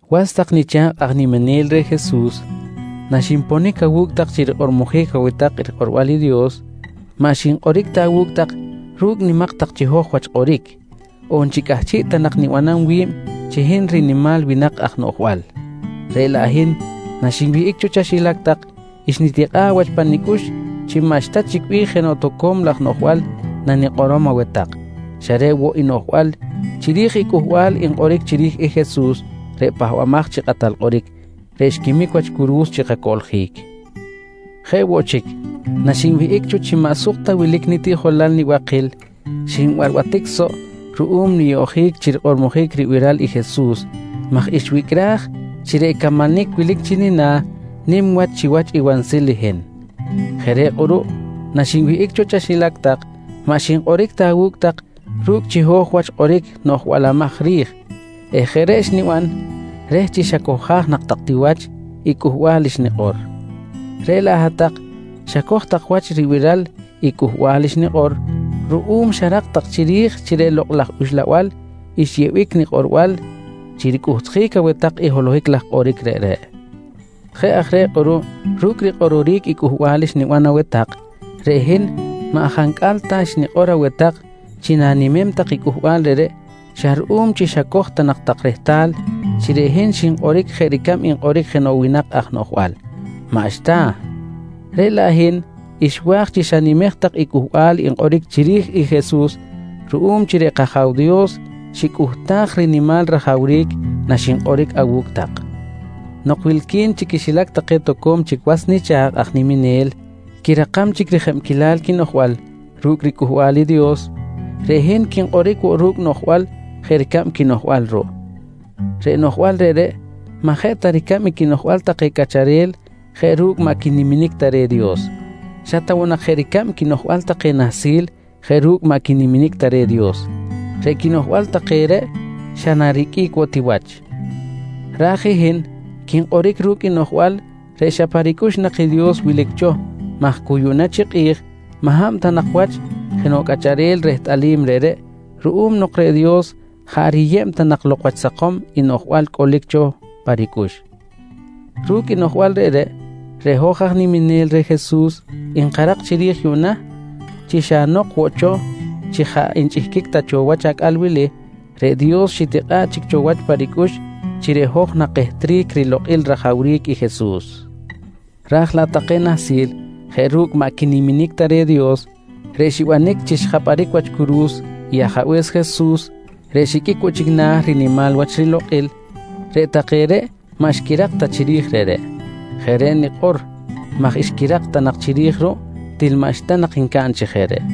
Was tak nicha̱kꞌ aj niminel reh Jesus, naxinponic awu̱cꞌ tak chi rikꞌormojic aweh tak rikꞌorbal i Dios, maꞌ xinkꞌoric ta awu̱cꞌ tak ru̱cꞌ nimak tak chiho̱j wach kꞌoric, on chi cꞌahchiꞌ ta nak nibanam wi̱b chi hin rinimal winak aj noꞌjbal. Reꞌ laꞌ hin naxinwihꞌic cho chaxilac tak, xnitikꞌa̱ꞌ wach pa nicꞌux chi maꞌxta chic bih jenoꞌ toco̱m laj noꞌjbal nanikꞌorom aweh tak, xa reꞌ woꞌ i noꞌjbal chiri̱j i cꞌuhbal nkꞌoric chiri̱j i Jesus reꞌ Pahbamaj chi Kꞌatal Kꞌoric, reꞌ xquimic wach curu̱s chi kacoꞌljic. Jeꞌ woꞌ chic, naxinwihꞌic cho chi maꞌ suk ta wilic nitiꞌjolal nibakil xinbarbatic soꞌ ruꞌum niyoꞌjic chi rikꞌormojic ribiral i Jesus maj xwicꞌraj chi reꞌ camanic wilic chi nina̱ nim wach chiwach i wansil i hin. Jeꞌ reꞌ kꞌuruꞌ naxinwihꞌic cho chaxilac tak maꞌ xinkꞌoric ta awu̱cꞌ tak ru̱cꞌ chiho̱j wach kꞌoric noꞌjbalamaj ri̱j eh jeꞌ reꞌ xniban reh chi xacohjaj nak tak ti wach i cꞌuhbal xnikꞌor. Reꞌ laꞌ hat-tak xacoj tak wach ribiral i cꞌuhbal xnikꞌor ruꞌum xarak tak chiri̱j chi reꞌ Lokꞌ laj Uxlabal xyeꞌbic nikꞌorbal chi ricꞌuhtjic aweh tak i holohic laj kꞌoric reꞌreꞌ. Jeꞌ aj reꞌ kꞌuruꞌ ru̱cꞌ rikꞌororic i cꞌuhbal xniban aweh tak, reꞌ hin maꞌ jancꞌal ta xnikꞌor aweh tak chi na̱nimem tak i cꞌuhbal reꞌreꞌ xa ruꞌum chi xacoj ta nak tak rehtal chi reꞌ hin xinkꞌoric jeꞌ ricab nkꞌoric jenoꞌ winak aj noꞌjbal, maꞌxta! Reꞌ laꞌ hin xwa̱j chi xanimej tak i cꞌuhbal nkꞌoric chiri̱j i Jesus ruꞌum chi reꞌ kAja̱w Dios xicꞌuhtaj rinimal rajawric naxinkꞌoric awu̱cꞌ tak. Nok wilqui̱n chi quixilac take toco̱m chic was nicha̱kꞌ aj niminel quirakam chic rijebquilal quinoꞌjbal ru̱cꞌ riCꞌuhbal i Dios, reꞌ hin quinkꞌoric woꞌ ru̱cꞌ noꞌjbal jeꞌ ricab quinoꞌjbal ruꞌ. Reꞌ noꞌjbal reꞌreꞌ maꞌ jeꞌ ta ricab i quinoꞌjbal take cꞌacharel jeꞌ ru̱cꞌ maꞌ quiniminic ta reh Dios, xa ta woꞌ nak jeꞌ ricab quinoꞌjbal take nahsil jeꞌ ru̱cꞌ maꞌ quiniminic ta reh i Dios. Reꞌ quinoꞌjbal take reꞌ xa nariqꞌuic woꞌ ti wach. Raj i hin quinkꞌoric ru̱cꞌ noꞌjbal reꞌ xa pa ricꞌux nak i Dios wilic cho maj cu yuꞌna chi kꞌi̱j maꞌ hab ta nak wach jenoꞌ cꞌacharel rehtꞌalim reꞌreꞌ ruꞌum nok reꞌ Dios jaꞌ riyeb ta nak lok wach sakom i noꞌjbal cꞌolic nak cho pa ricꞌux. Ru̱cꞌ i noꞌjbal reꞌreꞌ, reꞌ hoj aj niminel reh Jesus nkarak chiri̱j yuꞌna chi xa nok woꞌ cho chi jaꞌ nchꞌihquic ta cho wach acꞌal wili, reꞌ Dios xitikꞌa̱ꞌ chic cho wach pa ricꞌux chi reꞌ hoj nakehtric rilokꞌil rajawric i Jesus. Raj laꞌ take nahsil jeꞌ ru̱cꞌ maꞌ quiniminic ta reh i Dios reꞌ xibanic chi xjapꞌaric wach curu̱s i Ajabe̱s Jesus reꞌ xiqꞌuic woꞌ chic na̱ rinimal wach rilokꞌil, reꞌ take reꞌ maꞌ xquirak ta chiri̱j reꞌreꞌ. Jeꞌ reꞌ nikꞌor maj xquirak ta nak chiri̱j ruꞌ til maꞌxta nak ncaꞌn chi jeꞌ reꞌ.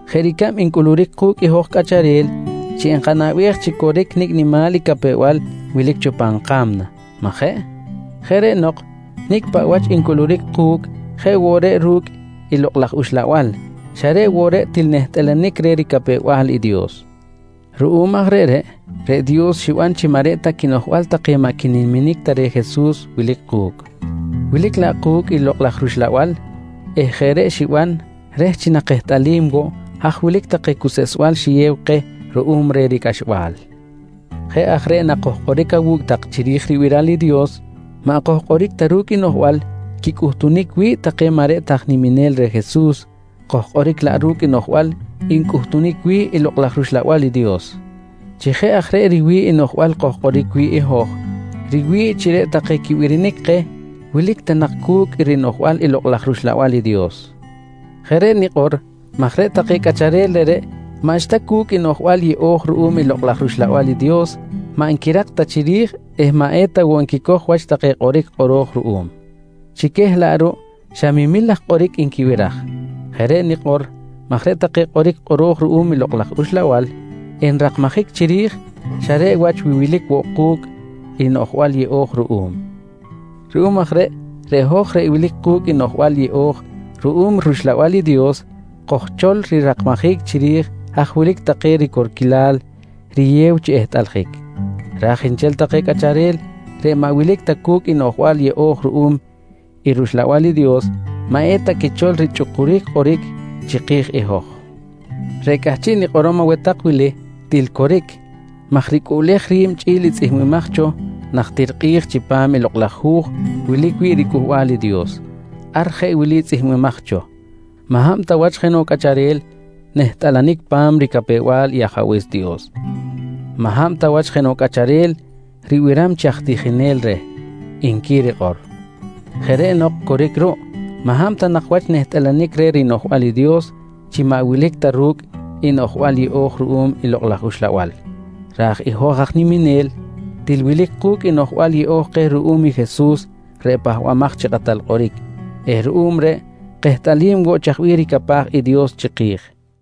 jeꞌ ricab ncꞌuluric ku̱cꞌ hoj cꞌacharel chi nkanaꞌbej chi coric nicꞌ nimal i capew-bal wilic cho pan ka̱mna, majeꞌ? Jeꞌ reꞌ nok nicꞌ paꞌ wach ncꞌuluric ku̱cꞌ jeꞌ woꞌ reꞌ ru̱cꞌ i Lokꞌ laj Uxlabal xa reꞌ woꞌ reꞌ til nehtꞌalanic reh ricapew-bal i Dios. Ruꞌum aj reꞌreꞌ, reꞌ Dios xiban chi maꞌ reꞌ ta quinoꞌjbal take maꞌ quiniminic reh Jesus wilic ku̱cꞌ, wilic laꞌ ku̱cꞌ i Lokꞌ laj rUxlabal eh jeꞌ reꞌ xiban reh chi nakehtꞌalim woꞌ haj wilic take cuseꞌsbal xiyew keh ruꞌum reh ricꞌaxbal. Jeꞌ aj reꞌ nakojkꞌoric awu̱cꞌ tak chiri̱j ribiral i Dios, maꞌ kojkꞌoric ta ru̱cꞌ i noꞌjbal quicꞌuhtunic wi̱ꞌ take maꞌ reꞌ ta aj niminel reh Jesus, kojkꞌoric laꞌ ru̱cꞌ noꞌjbal ncꞌuhtunic wi̱ꞌ i Lokꞌ laj rUxlabal i Dios. Chi jeꞌ aj reꞌ riwi̱ꞌ i noꞌjbal kojkꞌoric wi̱ꞌ i hoj, riwi̱ꞌ chi reꞌ take quibirinic keh wilic ta nak cu̱cꞌ i rinoꞌjbal i Lokꞌ laj rUxlabal i Dios. Jeꞌ reꞌ nikꞌor maj reꞌ take cꞌacharel reꞌreꞌ maꞌxta cu̱cꞌ i noꞌjbal yeꞌo̱j ruꞌum i Lokꞌ laj rUxlabal i Dios maꞌ nquirak ta chiri̱j eh maꞌ eta woꞌ nquicoj wach take kꞌoric kꞌoro̱j ruꞌum. Chi queh laꞌ ruꞌ xa memil laj kꞌoric nquibiraj. Jeꞌ reꞌ nikꞌor maj reꞌ take kꞌoric kꞌoro̱j ruꞌum i Lokꞌ laj Uxlabal enrakmajic chiri̱j xa reꞌ wach wi wilic woꞌ ku̱cꞌ i noꞌjbal yeꞌo̱j ruꞌum. Ruꞌum aj reꞌ, reꞌ hoj reꞌ wilic ku̱cꞌ i noꞌjbal yeꞌo̱j ruꞌum i rUxlabal i Dios kojchol rirakmajic chiri̱j haj wilic take ricorquilal riyew chi ehtꞌaljic. Raj nchel take cꞌacharel reꞌ maꞌ wilic ta cu̱cꞌ i noꞌjbal yeꞌo̱j ruꞌum i rUxlabal i Dios maꞌ eta quichol richꞌukuric kꞌoric chiki̱j i hoj. Reꞌ cꞌahchiꞌ nikꞌorom aweh tak wili til coric maj ricꞌuꞌlej ri̱b chꞌi̱l i tzꞌihmbimaj cho najtir kꞌi̱j chipam i Lokꞌ laj Hu̱j wilic wi̱ꞌ riCꞌuhbal i Dios. Ar jeꞌ wili tzꞌihmbimaj cho: “Maꞌ hab ta wach jenoꞌ cꞌacharel nehtꞌalanic pa̱m ricapew-bal i Ajabe̱s Dios. Maꞌ hab ta wach jenoꞌ cꞌacharel riban chi aj tijinel reh, nqui rikꞌor. Jeꞌ reꞌ nok coric ruꞌ maꞌ hab ta nak wach nehtꞌalanic reh rinoꞌjbal i Dios chi maꞌ wilic ta ru̱cꞌ i noꞌjbal yeꞌo̱j ruꞌum i Lokꞌ laj Uxlabal, raj i hoj aj niminel til wilic ku̱cꞌ i noꞌjbal yeꞌo̱j keh ruꞌum i Jesus reꞌ Pahbamaj chi Kꞌatal Kꞌoric eh ruꞌum reꞌ kehtꞌalim woꞌ chaj bih ricapaj i Dios chiki̱j.